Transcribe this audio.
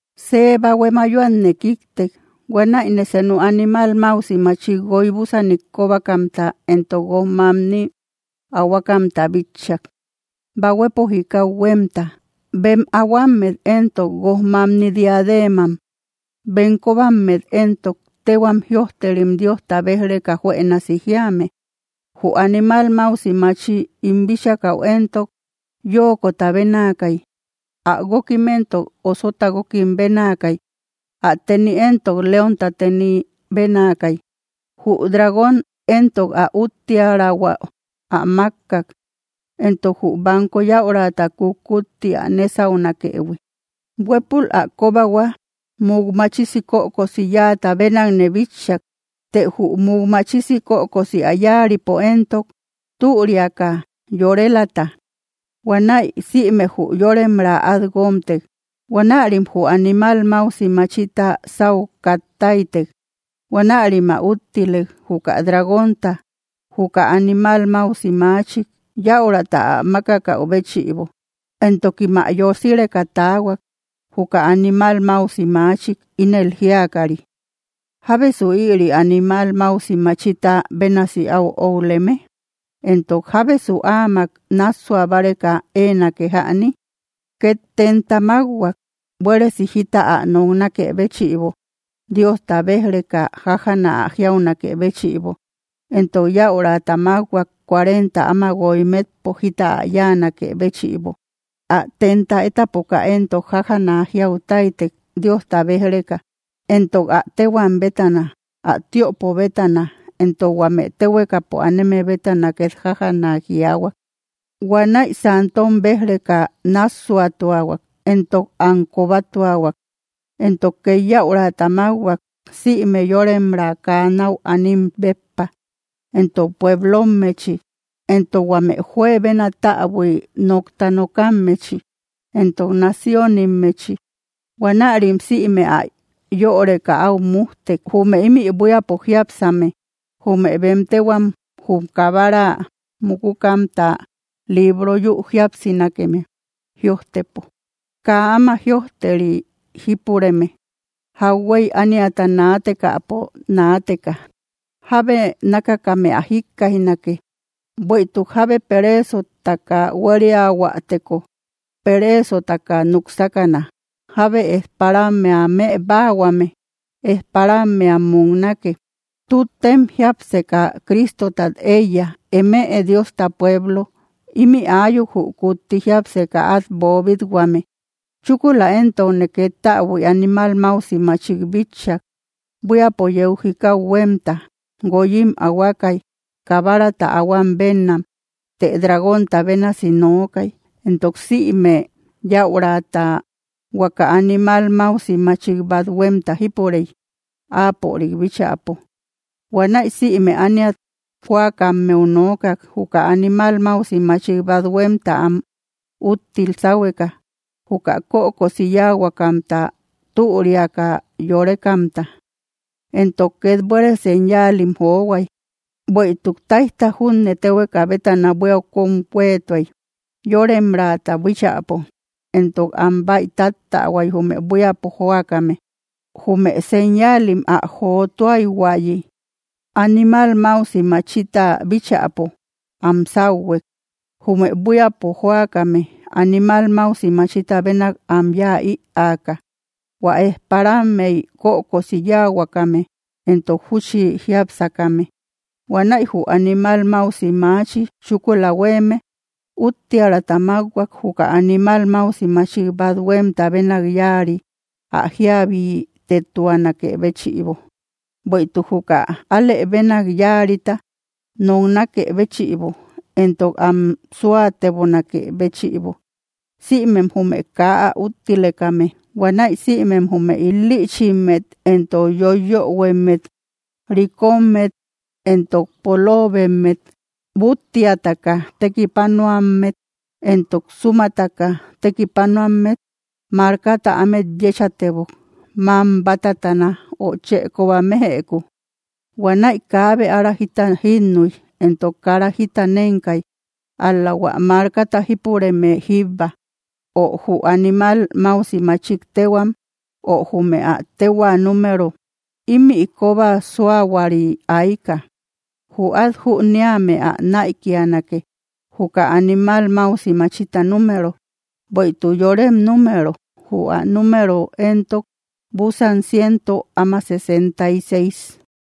See bahue mayoatne kíktek. Huanäine senu animal máusi machik guoy búsanim kóbakamta éntok guoj mamnim ahuakamta bitchak, bahuepo jikau huémta. Bem ahuammet éntok, guoj mamni diadeenam; bem kóbammet éntok, téhuam jïojterim Diosta béj‑reka juënasi jíame. Jü animal máusi maachi ín bíchakäu éntok, yóokota bénaakay. Ä guókim éntok, osota guókim bénaakay. Ä teni éntok, leónta teni bénaakay. Jü dragón éntok ä úttiärahua ä mákkak, entok jü banko yäurata kutkutti ä nésaunakëhui. Huépul ä kóbahua muk máchisi kökosi yáata bénakne bitchak, të jü muk máchisi kökosi ä yáaripo éntok, türiaka yorelata. Huanäi sïme jü yóremra át guómtek. Huanärim jü animal máusi machita sáu kat táytek. Huanärim ä úttilek, juka dragónta, juka animal máusi machik yäurata ä mákakäu béchïbo; entokim ä yosireka taahuak, juka animal máusi maachik, ínel jíakari: —¿Jábesu ïri animal máusi machita bénasi áu óuleme? Entok, ¿jábesu áamak nássua báreka éenake jäni? Két tenta mákhuak, buéresi jita ä noknakë béchïbo, Diosta béj‑reka jájana ä jiaunakë béchïbo. Entok yäurata mákhuak, cuarenta áma guoy metpo, jita ä yáanakë béchïbo. Ä tenta étapoka éntok, jájana jiau táytek, Diosta béj‑reka. Entok ä téhuam bétana, ä tiöpo bétana, éntok huame téhuekapo aneme bétana két jájana jiaahuak. Huanäi santom bej‑reka nássuatuahuak, entok am kobatuahuak. Entok ket yäurata mákhuak, sïme yóremra kaa náu anim béppa, entok pueblommechi, entok huame juebena täbui nokta nokammechi, entok naciónimmechi. Huanäirim sïme ä yöreka áu mújtek, jume imï buíapo jiápsame, jume bem téhuam jum Kabara, mukukamta libro yü jíapsinake me jïojtepo, kaa áma jïojteri jípureme, jauhuey ániata naatekäpo naateka. Jábe nákakame ä jikkaijnake: Bueïtuk jábe pereesota hueríateko, pereesotaka núk sákana; jábe ejparammea më báahuame, ejparammea muknake. Tuttem jiápseka Cristotat éiya, eme Diosta pueblo, imï ayuk jü kutti jiapseka at boobit-huame. Chúkula éntokne ket täbui animal máusi machik bitchak, buíapo yeu jikau huémta. Guoyim ahuakay, kabarata ahuam bénnam, të dragónta bénasi nookay. Éntok sïme yäurata huaka animal máusi machik bat huémta jípurey, áapörik bíchäpo. Huanäi sïme ániat jóakammeu nookak, juka animal máusi machik bat huémta am úttil sáhueka, juka kökosi yáahuakamta, türiaka yorekamta. Éntok két buére señaalim johuay. Bueïtuk táijta junne téhueka bétana buíau kom huéetuay, yóremraata bíchäpo. Entok am bäi táttähuay, jume buíapo jóakame, jume señaalim ä jotuaïhuayi, animal máusi machita bíchäpo. Am sáuhuek, jume buíapo jóakame, animal máusi machita bénak am yáa ïaka, hua ejparammey kökosi yáahuakame, entok júchi jiápsakame. Huanäi jü animal máusi maachi chúkula huéeme úttiärata mákhuak, juka animal máusi machik bat huémta bénak yáari, ä jíabitetuanakë béchïbo, bueïtuk juka alë bénak yáarita noknakë béchïbo, éntok am súatebonakë béchïbo, sïmem jume kaa ä úttilekame. Huanäi sïmem jume il‑lïchimmet éntok yoiyöhuemmet, rikommet éntok poloobemmet, búttiataka tekipanuammet éntok súmataka tekipanuammet, markata ámet yéchatebok, mam bátatana ö chë kóba méjëku. Huanäi kaabe ára jita jínnuy, entok kara jita nenkay, ál‑la hua markata jípureme jíbba, ö jü animal máusi machik téhuam, ö jume ä téhuaa número. Ímï koba suahuari aika; jü át jüniame ä näikianake, juka animal máusi machita número, bueïtuk yorem número. Jü ä número éntok, búsan ciento áma sesenta y seis.